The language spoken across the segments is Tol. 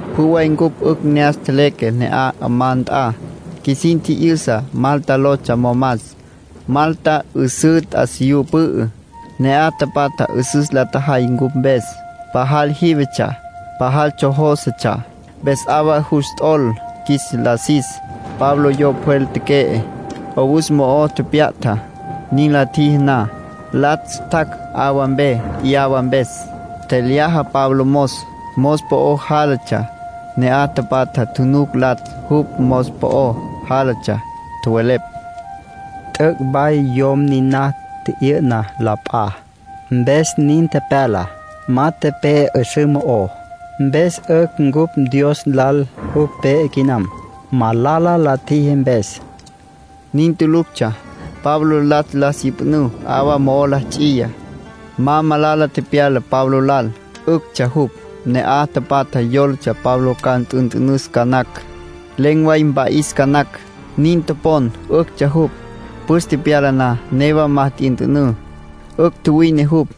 Pjü way cupj 'ücj ne'as tjeleque ne'aj 'amá nt'a. Qjuisin tji'yüsa Malta lotsja momas. Malta 'üsǘ t'asiyú pü'ü. Ne'aj tapatja 'üsüs la tjajay cupj mpes. Pajal jívetsja, pajal tsjojósetsja, mpes 'awa jus t'ol qjuis la sis. Pablo yo pjwel teque'e, 'owus mo'o tepya'ta. Nin la tjiji na, latsj tjac' 'awa mpe 'yawa mpes. Tjelyaja Pablo mos, mos po'o jálatsja. Ne'aj tapatja tjunuc latsj jupj mos po'o jálatsja, tjowelepj: “T'üc' way yom niná tji'yü'na la p'a, mpes nin tepyala. Ma tepe'e 'üsǘ mo'ó. Mpes 'ücj cupj dios lal jupj pe'e quinam, malala la tjiji mpes”, nin tjowelepj. Nin tuluctsja. Pablo latsj la syüpjünǘ, 'awa mo'o la ts'iya. Ma malala tepyala Pablo lal, 'üctsja jupj. Ne'aj tapatja yólatsja Pablo ca nt'ünt'ünüs ca nacj. Len̈ way mpa'is ca nacj, nin topon. 'Üctsja jupj. Püs tepyala na, newa ma t'yünt'ünǘ, 'ücj tjuwine jupj.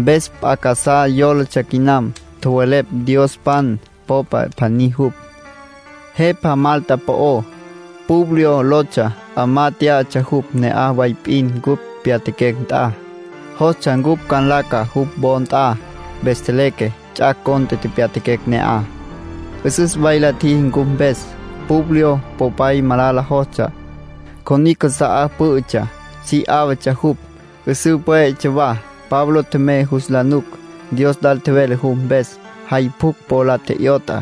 Mpes p'a casá yólatsja quinam. Tjowelepj diospan popa pjaní jupj. Jepa Malta po'ó, Publio lotsja. 'Amá tyá'atsja jupj ne'aj way p'in cupj tepyatjaquecj nt'a. Jostsja cupj ca nlaca jupj wo nt'a. Mpes tjeleque. Ts'ac' cont'e tepyatjaquecj ne'aj. 'Üsüs way la tjiji cupj mpes. Publio popay malala jostsja. Cjonicj casa'á pǘ'ütsja. Si 'áwatsja jupj, 'üsǘ pwé'etsja wa. Pablo tjemey jus la nuc. Dios lal tjevele jupj mpes. Jay pjucj po la tje'yot'a,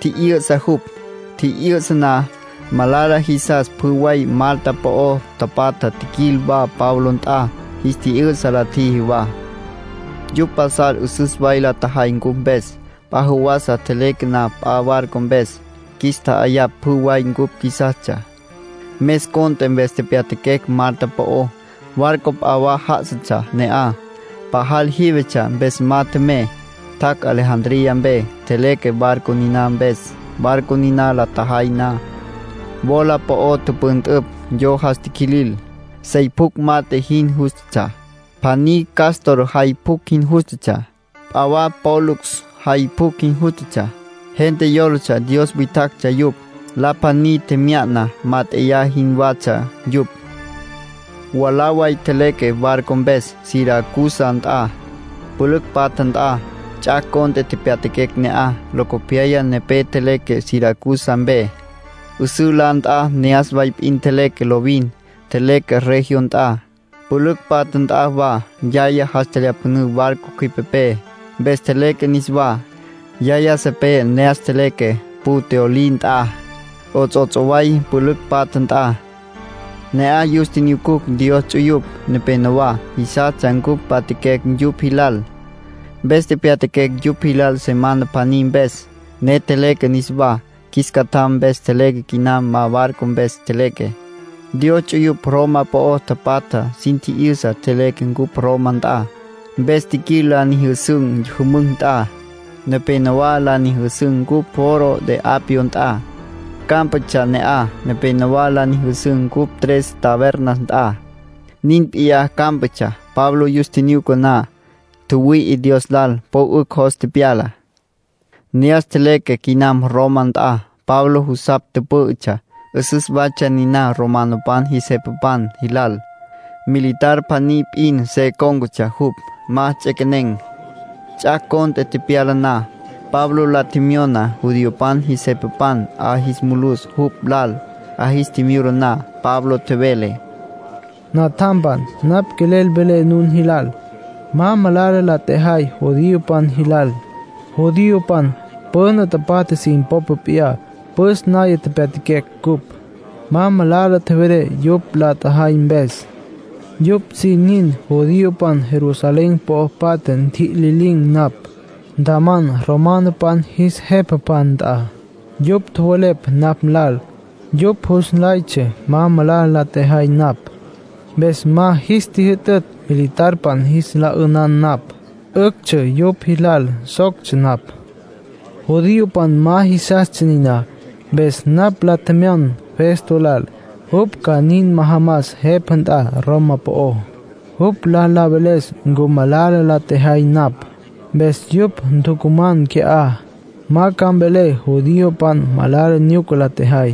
tji'yü'sa jupj. Tji'yü'sa na, malala jisas pjü way Malta po'o tapatja tjiquil wa Pablo nt'a. Jis tji'yü'sa la tjiji wa. Yupj pasal 'üsüs way la tjajay cupj mpes. P'a jawasa tjeleque na p'a barco mpes, qjuis tja'ayapj pjü way cupj qjuisastsja. Mes cont'e mpes tepyatjaquecj Malta po'ó. Barco p'a wa já'asatsja ne'aj. Pajal jívetsja mpes ma tjemey. Tjac' Alejandría mpe. Tjeleque barco niná mpes. Barco niná la tjajay na, wola po'o tüpüntüpj yo jas tiquilil, sey pjucj mat'e jin jústatsja. Pjaní Cástor jay pjucj jin jústatsja. P'a wa Pólux jay pjucj jin jústatsja. Gente yólatsja dios witjactsja yupj. La pjaní tjemya'na mát'eya jinwatsja yupj. Mwalá way tjeleque barco mpes Siracusa nt'a, pülücj patja nt'a. Ts'ac' cont'e tepyatjaquecj ne'aj. Locopyaya nepé tjeleque Siracusa mpe, 'üsǘ la nt'a ne'as way p'in tjeleque lovin. Tjeleque Regio nt'a, pülücj patja nt'a wa. Yaya jas tjelyapjünǘ barco cjüipepé. Mpes tjeleque niswá. Yaya sipé ne'as tjeleque Puteoli nt'a, 'ots'ots' way pülücj patja nt'a. Ne'aj yus tjinyucucj Dios ts'uyupj nepenowá. Jisastsja cupj mpatjaquecj yupj jilal. Mpes tepyatjaquecj yupj jilal semana pjaní mpes, ne tjeleque niswá. Qjuis tsjam mpes tjeleque quinam, ma barco mpes tjeleque. Dios ts'uyupj Roma po'o tapatja sin tji'yüsa léquetsja cupj Roma nt'a. Mpes tjiquil la nyüjüsün̈ jümücj nt'a. Nepénowa la nyüjüsün̈ cupj Foro de Apio nt'a, cámpatsja ne'aj. Nepénowa la nyüjüsün̈ cupj Tres Tabernas nt'a, nin p'iyá cámpatsja. Pablo yus tjinyuca na, tjüwüi'i Dios lal, po 'ücj jos tepyala. Ne'as tjeleque quinam Roma nt'a. Pablo jusapj tüpǘ'ütsja; 'üsüs waytsja niná romanopan jis jepapan jilal. Militar pjaní p'in se cón̈catsja jupj, ma nts'equenem. Ts'ac' cont'e tepyala na, Pablo la tjemyona judiopan jis jepapan 'a jis mulus jupj lal. 'A jis tjimyula na, Pablo tjevele: —Natjampan, napj quelel velé nun jilal. Ma malala la tjejay judiopan jilal. Judiopan püna tapatja sin popa p'iyá püs naya pyatjaquecj cupj. Ma malala tjevelé yupj la tjajay mpes. Yupj sin nin judiopan Jerusalén po'o patja ntjitjililin̈ napj. Ntjaman romanopan jis jepapan nt'a. Yupj tjowelepj napj lal. Yupj jus nlaytsja ma malala la tjejay napj. Mpes ma jis tjüjütütj militarpan jis la 'ünan napj. 'Üctsja yupj jilal soctsja napj. Judiopan ma jisastsja niná. Mpes napj la tjemyon Festo lal jupj ca nin majamas jepa nt'a Roma po'ó, jupj la veles ncu malala la tjejay napj. Mpes yupj ntucuman qui'á. Ma ca mvelé judiopan malala nyuca la tjajay.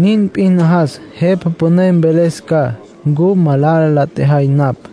Nin p'in najas jepa püné mveles ca ncu malala la tjejay napj.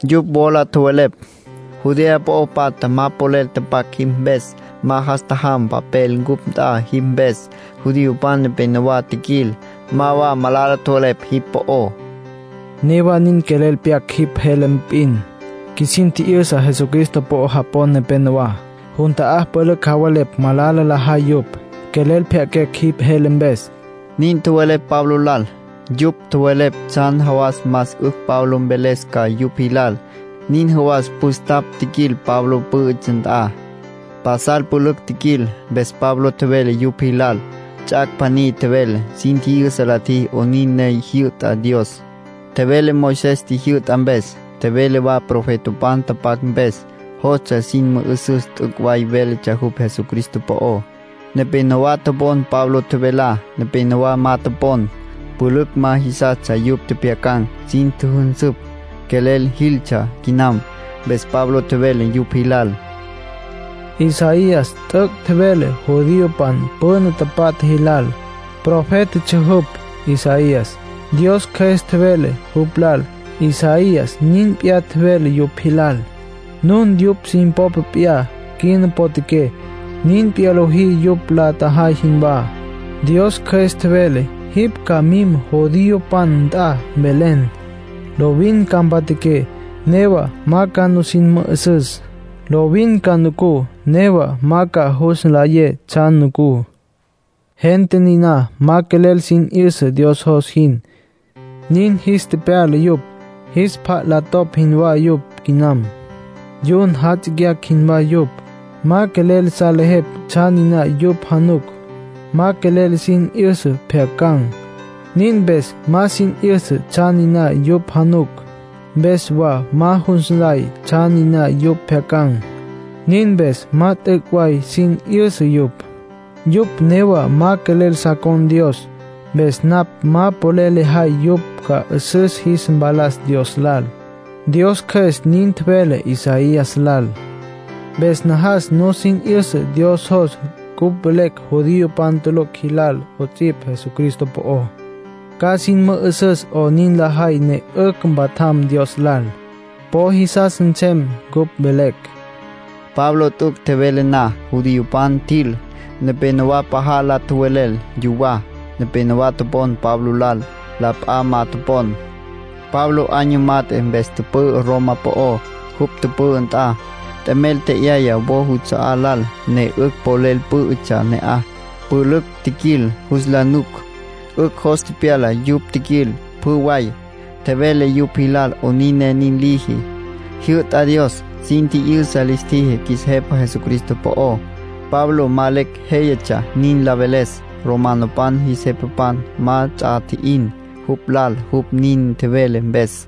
Yupj wola tjowelepj: —Judea po'o patja ma papel tapac jipj mpes. Ma jas tjajam papel cupj nt'a jipj mpes. Judiopan nepenowá tjiquil; ma wa malala tjowelepj jipj po'ó. Newa nin quelel pjyaquecj jipj jele p'in. Qjuisin tji'yüsa Jesucristo po'o japon nepenowá. Jun ta'á pülücj javelepj malala lajay yupj. Quelel pjyaquecj jipj jele mpes —nin tjowelepj Pablo lal. Yupj tjowelepj tsjan jawas más 'ücj Pablo mveles ca yupj jilal. Nin jawas püstapj tjiquil Pablo pǘ'ütsja nt'a. Pasal pülücj tjiquil. Mpes Pablo tjevele yupj jilal. Ts'ac' pjaní tjevele. Sin tji'yüsa la tjiji 'onin ne jyü'ta Dios. Tjevele Moisés tjijyü'ta mpes. Tjevele wa profetapan tapac mpes. Jostsja sin mü'üsüs t'üc' way véletsja jupj Jesucristo po'ó. Nepénowa topon Pablo tjevelá. Nepénowa ma topon. Pülücj ma jisastsja yupj tjepjyacan̈. Sin tjüjünsüpj, quelel jiltsja quinam. Mpes Pablo tjevele yupj jilal: “Isaías t'üc' tjevele judiopan püna tapatja jilal. Profétatsja jupj, Isaías. Dios Cjües tjevele jupj lal, Isaías nin p'iyá tjevele yupj jilal. Nun yupj sin popa p'iyá quina potjaqué, nin p'iyá lojí yupj la tjajay jinwá. Dios Cjües tjevele: ‘Jipj ca mim judiopan nt'a, mvelen: “Lovin ca mpja'aqué, newa ma ca nusin mü'üsüs. Lovin ca nucú, newa ma ca jus nlayé tsjan nucú. Gente niná ma quelel sin 'yüsa Dios jos jin, nin jis tepyala yupj. Jis pjat la topj jinwá yupj quinam. Yun jatsicyacj jinwá yupj. Ma quelel salejepj tsjan niná yupj januc. Ma quelel sin 'yüsa pjyacan̈. Nin mpes ma sin 'yüsa tsjan niná yupj januc. Mpes wa ma jus nlay tsjan niná yupj pjyacan̈. Nin mpes ma t'üc' way sin 'yüsa yupj. Yupj newa ma quelel sa con̈ Dios, mpes napj ma polel lejay yupj ca 'üsüs jis mpalas Dios lal.” ’ Dios Cjües nin tjevele Isaías lal. Mpes najas nusin 'yüsa Dios jos cupj velecj judiopan tulucj jilal 'ots'ipj Jesucristo po'ó. Ca sin mü'üsüs 'onin lajay ne 'ücj mpatjam Dios lal. Po jisas nsem cupj velecj”, Pablo nin tjevele. Pablo t'üc' tjevele na, judiopan tjil. Nepénowa pajal la tjowelel yuwá. Nepénowa topon Pablo lal, la p'a ma topon. Pablo año mat'e mpes tüpü'ü Roma po'ó. Jupj tüpü'ü nt'a, t'emel tje'yaya wo juts'a'á lal ne 'ücj polel pǘ'ütsja ne'aj. Pülücj tjiquil jus la nuc. 'Ücj jos tepyala yupj tjiquil, pjü way. Tjevele yupj jilal 'onin ne nin liji, jyü'ta Dios. Sin tji'yüsa lis tjiji qjuis Jepa Jesucristo po'ó. Pablo ma lecj jéyatsja nin la veles. Romanopan jis jepapan ma ts'a tji'in jupj lal jupj nin tjevele mpes.